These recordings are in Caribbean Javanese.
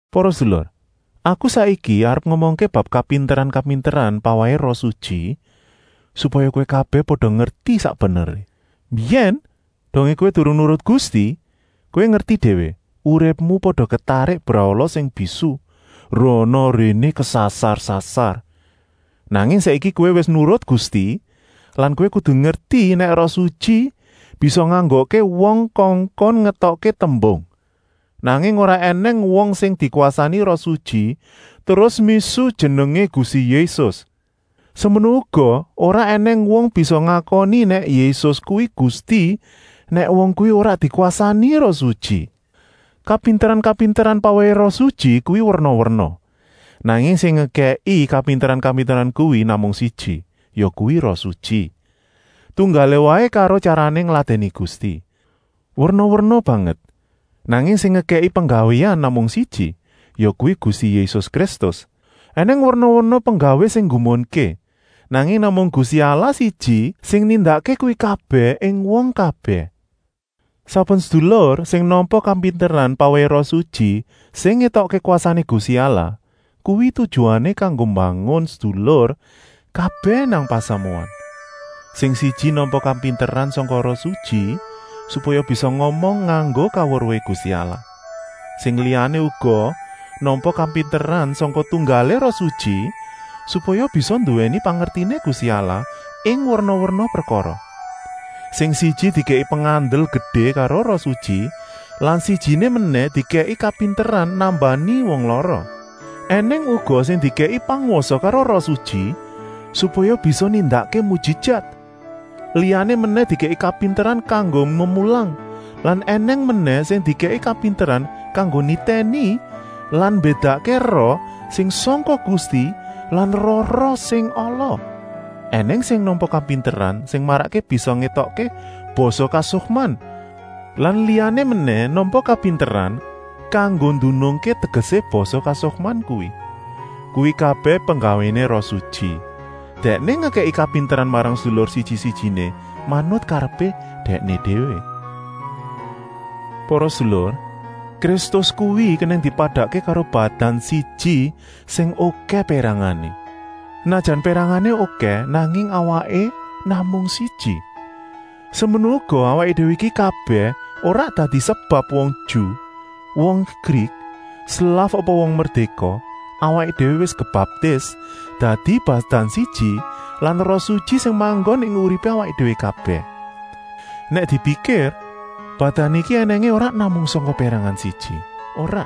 Para sedulur, aku saiki arep ngomongké bab kapinteran-kapinteran pawèhé Roh Sutyi, supaya kowé kabèh pada ngerti sak beneré. Mbiyèn, dongé kowé durung nurut Gusti, kowé ngerti déwé, uripmu pada ketarik brahala sing bisu, rana-réné kesasar-sasar. Nanging saiki kowé wis nurut Gusti lan kowé kudu ngerti nèk Roh Sutyi bisa nganggokké wong kongkon ngetokké tembung, nanging ora ènèng wong sing dikwasani Roh Sutyi terus misuh jenengé Gusti Yésus. Semono uga ora ènèng wong bisa ngakoni nèk Yésus kuwi Gusti, nèk wong kuwi ora dikwasani Roh Sutyi. Kapinteran-kapinteran pawèhé Roh Sutyi kuwi werna-werna, nanging sing ngekèki kapinteran-kapinteran kuwi namung siji, yakuwi Roh Sutyi. Tunggalé waé karo tyarané ngladèni Gusti, werna-werna banget, nanging sing ngekèki penggawéan namung siji, yakuwi Gusti Yésus Kristus. Enèng werna-werna penggawé sing nggumunké, nanging namung Gusti Allah siji sing nindakké kuwi kabèh ing wong kabèh. Saben sedulur sing nampa kapinteran pawèhé Roh Sutyi sing ngétokké kwasané Gusti Allah kuwi tujuané kanggo mbangun sedulur kabèh nang pasamuan. Sing siji nampa kapinteran sangka Roh Sutyi supaya bisa ngomong nganggo kaweruhé Gusti Allah. Sing liyané uga nampa kapinteran sangka tunggalé Roh Sutyi supaya bisa nduwèni pangertiné Gusti Allah ing werna-werna prekara. Sing siji dikèki pengandel gedé karo Roh Sutyi lan sijiné menèh dikèki kapinteran nambani wong lara. Enèng uga sing dikèki pangwasa karo Roh Sutyi supaya bisa nindakké mujijat, liyané menèh dikèki kapinteran kanggo memulang lan ènèng menèh sing dikèki kapinteran kanggo nitèni lan mbédakké roh sing sangka Gusti lan roh-roh sing ala. Enèng sing nampa kapinteran sing marakké bisa ngetokké basa kasukman lan liyané menèh nampa kapinteran kanggo ndunungké tegesé basa kasukman kuwi. Kuwi kabèh penggawéné Roh Sutyi, Dèkné ngekèki kapinteran marang sedulur siji-sijiné manut karepé Dèkné déwé. Para sedulur, Kristus kuwi kenèng dipadakké karo badan siji sing okèh pérangané. Senajan pérangané okèh, nanging awaké namung siji. Semono uga awaké déwé iki kabèh, ora dadi sebab wong Ju, wong Grik, slaf apa wong merdéka, awaké déwé wis kebaptis dadi badan siji lan Roh Sutyi sing manggon ing uripé awaké déwé kabèh. Nèk dipikir, badan iki ènèngé ora namung sangka pérangan siji, ora,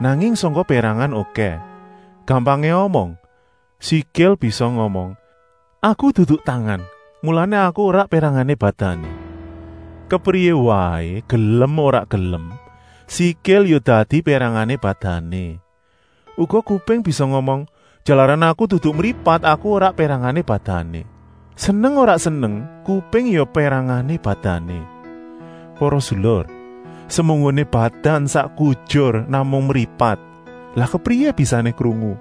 nanging sangka pérangan okèh. Gampangé omong, sikil bisa ngomong: “Aku dudu tangan, mulané aku ora pérangané badané.” Kepriyé waé, gelem ora gelem, sikil ya dadi pérangané badané. Uga kuping bisa ngomong: “Jalaran aku dudu mripat, aku ora pérangané badané.” Seneng ora seneng kuping ya pérangané badané. Para sedulur, semunggoné badan sak kujur namung mripat, lah kepriyé bisané krungu?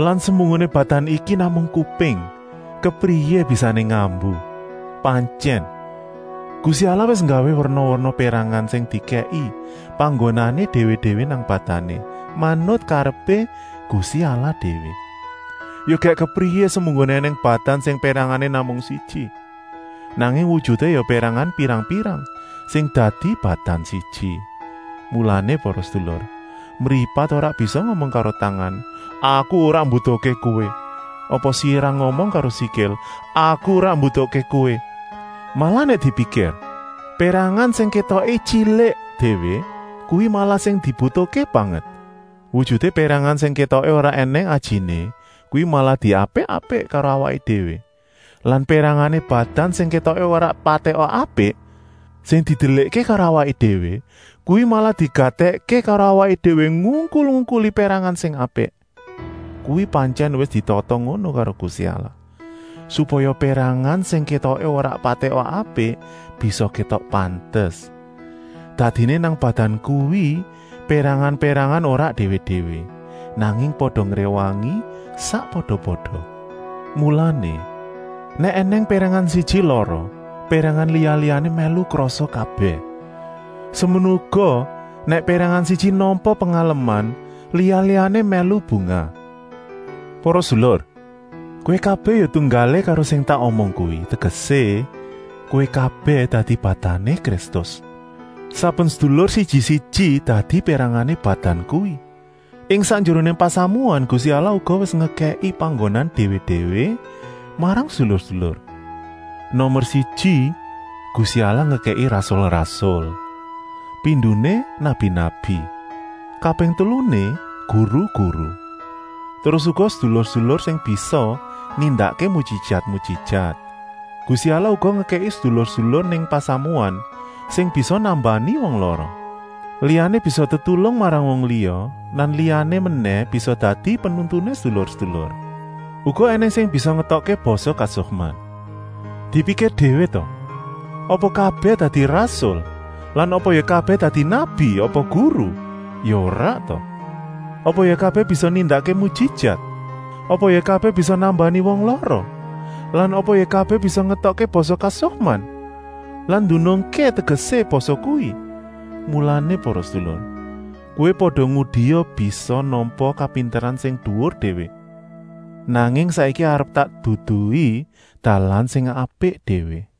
Lan semunggoné badan iki namung kuping, kepriyé bisané ngambu? Pantyèn, Gusti Allah wis nggawé werna-werna pérangan sing dikèki panggonané déwé-déwé nang badané, manut karepé Gusti Allah déwé. Ya gèk kepriyé semunggoné ènèng badan sing pérangané namung siji. Nanging wujuté ya pérangan pirang-pirang sing dadi badan siji. Mulané para sedulur, mripat ora bisa ngomong karo tangan: “Aku ora mbutuhké kowé,” apa sirah ngomong karo sikil: “Aku ora mbutuhké kowé!” Malah nèk dipikir, pérangan sing kétoké tyilik déwé, kuwi malah sing dibutuhké banget. Wujuté pérangan sing kétoké ora ènèng ajiné, kuwi malah diapik-apik karo awaké déwé lan pérangané badan sing kétoké ora patèka apik, sing didelikké karo awaké déwé, kuwi malah digatèkké karo awaké déwé ngungkul-ungkuli pérangan sing apik. Kuwi pantyèn wis ditata ngono karo Gusti Allah, supaya pérangan sing kétoké ora patèka apik bisa kétok pantes. Dadiné nang badan kuwi pérangan-pérangan ora déwé-déwé, nanging pada ngréwangi sakpada-pada. Mulané, nèk ènèng pérangan siji lara, pérangan liya-liyané mèlu krasa kabèh. Semono uga, nèk pérangan siji nampa pengaleman, liya-liyané mèlu bungah. Para sedulur, kowé kabèh ya tunggalé karo sing tak omong kuwi, tegesé, kowé kabèh dadi badané Kristus. Saben sedulur siji-siji dadi pérangané badan kuwi. Ing sakjeroné pasamuan Gusti Allah uga wis ngekèki panggonan déwé-déwé marang sedulur-sedulur. Nomer siji Gusti Allah ngekèki rasul-rasul; pindoné nabi-nabi; kaping teluné guru-guru; terus uga sedulur-sedulur sing bisa nindakké mujijat-mujijat. Gusti Allah uga ngekèki sedulur-sedulur nang pasamuan sing bisa nambani wong lara. Liyané bisa tetulung marang wong liya lan liyané menèh bisa dadi penuntuné sedulur-sedulur. Uga ènèng sing bisa ngetokké basa kasukman. Dipikir déwé ta, apa kabèh dadi rasul lan apa ya kabèh dadi nabi apa guru, ya ora ta! Apa ya kabèh bisa nindakké mujijat? Apa ya kabèh bisa nambani wong lara lan apa ya kabèh bisa ngetokké basa kasukman lan ndunungké tegesé basa kuwi. Mulané para sedulur, kowé pada ngudia bisa nampa kapinteran sing duwur déwé. Nanging saiki arep tak duduhi dalan sing apik déwé.